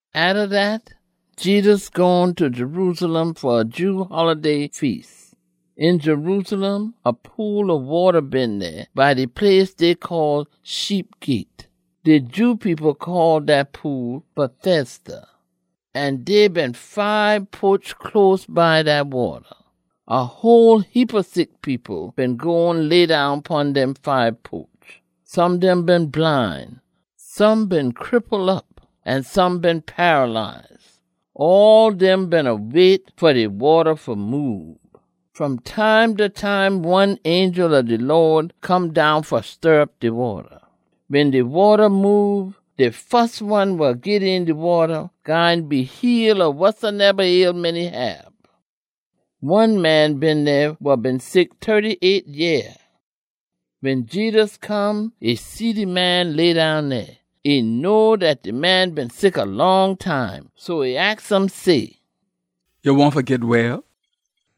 Atta dat, Jedus gone ta Jerusalem fa a Jew holiday feas. Een Jerusalem, a pool ob wata been dey by de place dey call “Sheep Gyate.” De Jew people call dat pool Bethesda, an dey been fibe poch close by dat wata. A whole heapa sick people been gone leddown pon dem fibe poch. Some dem been bline, some been cripple op, an some been paralyze. [All dem beena wait fa de waata fa moob. Fom time ta time one angel ob de Lawd come down fa stir op de wata. Wen de wata moob, de fus one wa git een de wata gwine be heal ob wasoneba ailment e hab.] One man been dey wa been sick tirty-eight yeah. Wen Jedus come, e see de man leddown dey. E know dat man been sick a long time, so e aks um say, “Ya wahn fa git well?”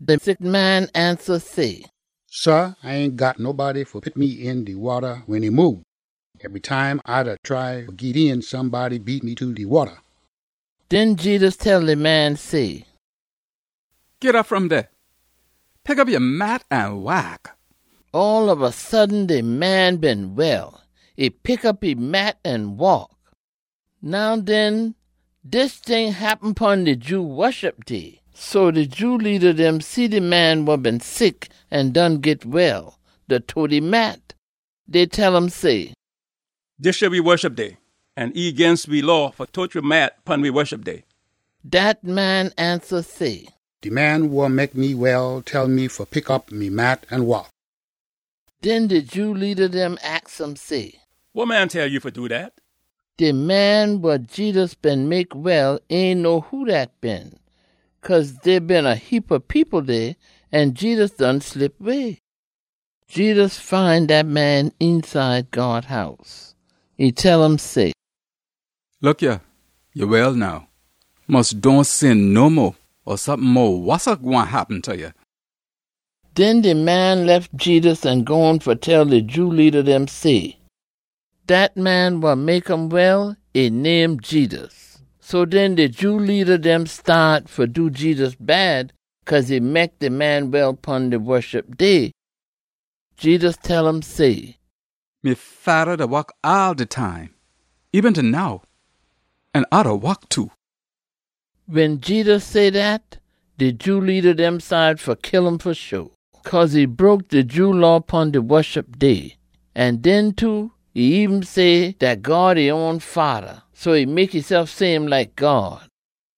De sick man ansa say, “Sah, A ain got nobody fa pit me een de wata wen e moob. Ebry time A da try fa git een, somebody beat me ta de wata.” Den Jedus tell de man say, “Git op fom dey. Pick op ya mat an waak!” All ob a sudden de man been well. E pick op e mat an waak. Now den, dis ting happen pon de Jew Woshup Day. So de Jew leada dem see de man wa been sick an done git well, da tote e mat. Dey tell um say, “Dis yah we Woshup Day, an e ginst we Law fa ya fa tote ya mat pon we Woshup Day.” Dat man ansa say, “De man wa mek me well tell me fa pick op me mat an waak.” Den de Jew leada dem aks um say, “Wa man tell ya fa do dat?” De man wa Jedus been mek well ain know who dat been, cause dey been a heapa people dey, an Jedus done slip way. Jedus find dat man eenside God House. E tell um say, “Look yah, ya well now. Mus dohn sin no mo, or sompin mo wossa gwine happen ta ya.” Den de man lef Jedus an gone fa tell de Jew leada dem say, dat man wa mek um well, e name Jedus. So den de Jew leada dem staat fa do Jedus bad cause e mek de man well pon de Woshup Day. Jedus tell um say, “Me Fada da wok all de time eben ta now, an A da wok too.” Wen Jedus say dat, de Jew leada dem cide fa kill um fa sho, cause e broke de Jew Law pon de Woshup Day. An den too, e eben say dat God e own Fada, so e mek esef same like God.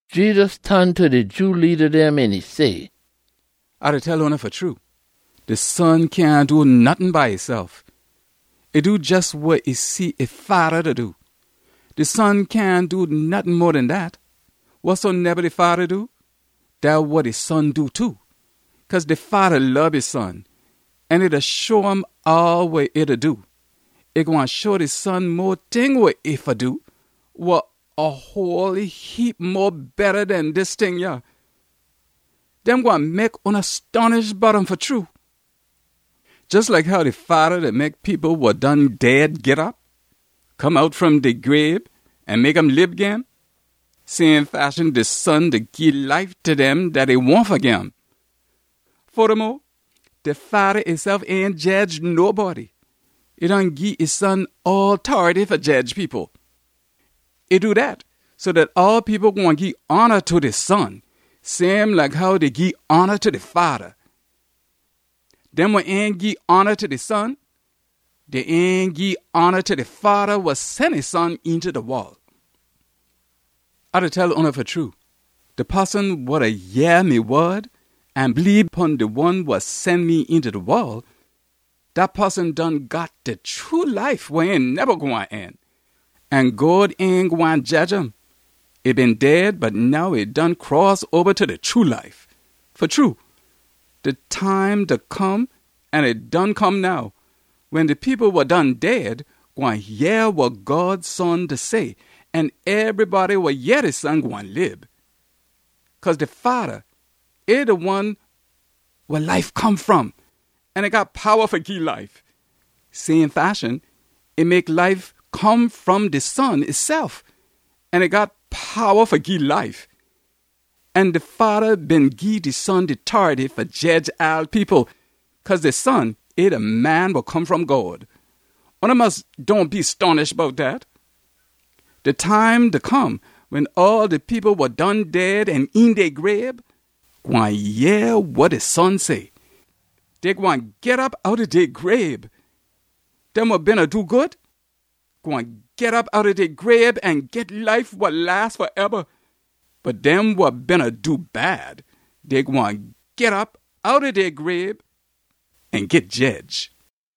Jedus ton ta de Jew leada dem an e say, “A da tell oona fa true, de Son cyahn do nottin by esef. E do jes wa e see e Fada da do. De Son cyahn do nottin mo den dat. Wasoneba de Fada do, dat wa de Son do too. Cause de Fada lob e Son an e da show um all wa e da do. E gwine show de Son mo ting wa e fa do wa a whole heap mo betta den dis ting yah. Dem gwine mek oona stonish bout um fa true. Jes like how de Fada da mek people wa done dead git op, come out fom dey grabe an mek um lib gin, same fashion de Son da gii life ta dem dat e wahn fa gim. Fodamo, de Fada esef ain jedge nobody. E done gii e son all tority fa jedge people. E do dat so dat all people gwine gii hona ta de Son same like how dey gii hona ta de Fada. Dem wa ain gii hona ta de Son, dey ain gii hona ta de Fada wa sen de Son eenta de wol. “A da tell oona fa true, de poson wa da yeh me wod an bleebe pon de one wa sen me eenta de wol, dat poson done got de true life wa ain neba gwine end, an God ain gwine jedge um. E been dead, bot now e done cross oba ta de true life. Fa true, de time da come an e done come now, wen de people wa done dead gwine yeh wa God Son da say, an ebrybody wa yeh de Son gwine lib. Cause de Fada, e de one weh life come fom, an e got powa fa gii life. Same fashion, e mek life come fom de Son esef an e got powa fa gii life. An de Fada been gii de Son de tority fa jedge all people, cause de Son, e de Man wa Come fom God. Oona mus dohn be stonish bout dat. De time da come wen all de people wa done dead an een dey grabe gwine yeh wa de Son say. Dey gwine git op outta dey grabe. Dem wa beena do good gwine git op outta dey grabe an git life wa las faeba. Bot dem wa beena do bad, dey gwine git op outta dey grabe an git jedge.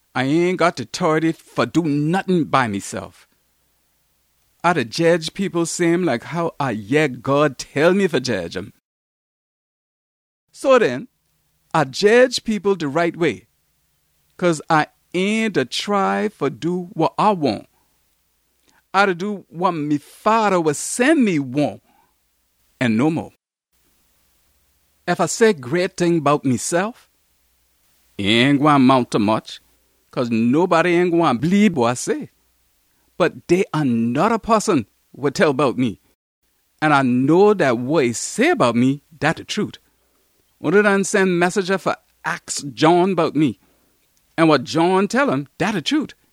“A ain got de tority fa do nottin by mesef. A da jedge people same like how A yeh God tell me fa jedge um. So den A jedge people de right way cause A ain da try fa do wa A wahn. A da do wa me Fada wa sen me wahn, an no mo. “Ef A say great ting bout mesef, e ain gwine mount ta much cause nobody ain gwine bleebe wa A say. Bot dey a noda poson wa tell bout me, an A know dat wa e say bout me, dat de trute. Oona done sen messenja fa aks John bout me, an wa John tell um, dat de trute.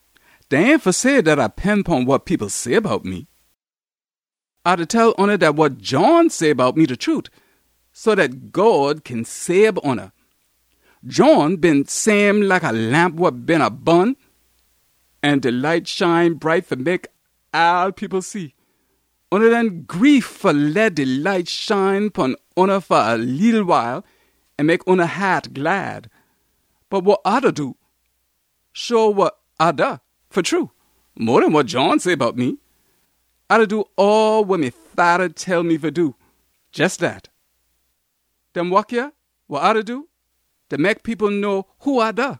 Dat ain fa say dat A pend pon wa people say bout me. A da tell oona dat wa John say bout me de trute, so dat God kin sabe oona. John been same like a lamp wa beena bun an de light shine bright fa mek all people see. Oona done gree fa leh de light shine pon oona fa a leetle wile an mek oona haat glad. Bot wa A da do show wa A da fa true, mo den wa John say bout me. A da do all wa me Fada tell me fa do, jes dat. Dem wok yah wa A da do da mek people know who A da.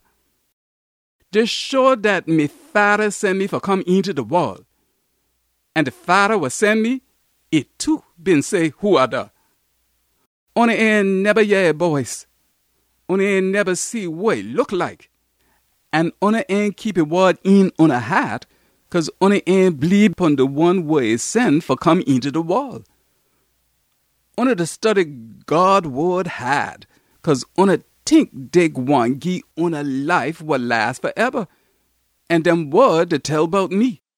Dey show dat me Fada sen me fa come eenta de wol. An de Fada wa sen me, e too been say who A da. Oona ain neba yeh e boice. Oona ain neba see wa e look like. An oona ain keep e wod een oona haat cause oona ain bleebe pon de one wa e sen fa come eenta de wol. Oona da study God wod haad cause oona tink dey gwine gii oona life wa las faeba. An dem wod da tell bout me!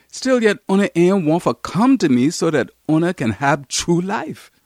Stillyet oona ain wahn fa come ta me so dat oona kin hab true life.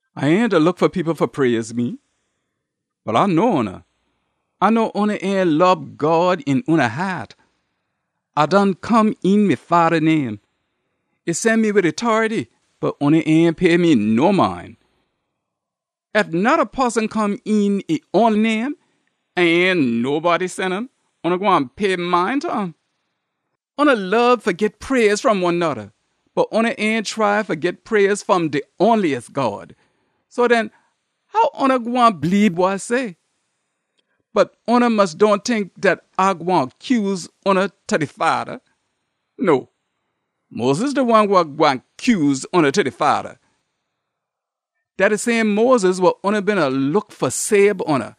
“A ain da look fa people fa praise me. Bot A know oona. A know oona ain lob God een oona haat. A done come een me Fada name. E sen me wid e tority, bot oona ain pay me no mind. Ef noda poson come een e own name an ain nobody sen um, oona gwine pay mind ta um. Oona lob fa git praise fom one noda. Bot oona ain try fa git praise fom de onliest God. So den how oona gwine bleebe wa A say? Bot oona mus dohn tink dat A gwine cuse oona ta de Fada. No, Moses de one wa gwine cuse oona ta de Fada. Dat de same Moses wa oona beena look fa sabe oona.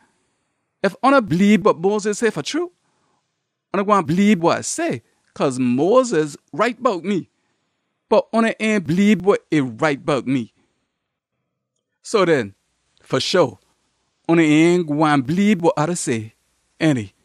Ef oona bleebe wa Moses say fa true, oona gwine bleebe wa A say, cause Moses write bout me. Bot oona ain bleebe wa e write bout me. So den fa sho oona ain gwine bleebe wa A da say, ainty?”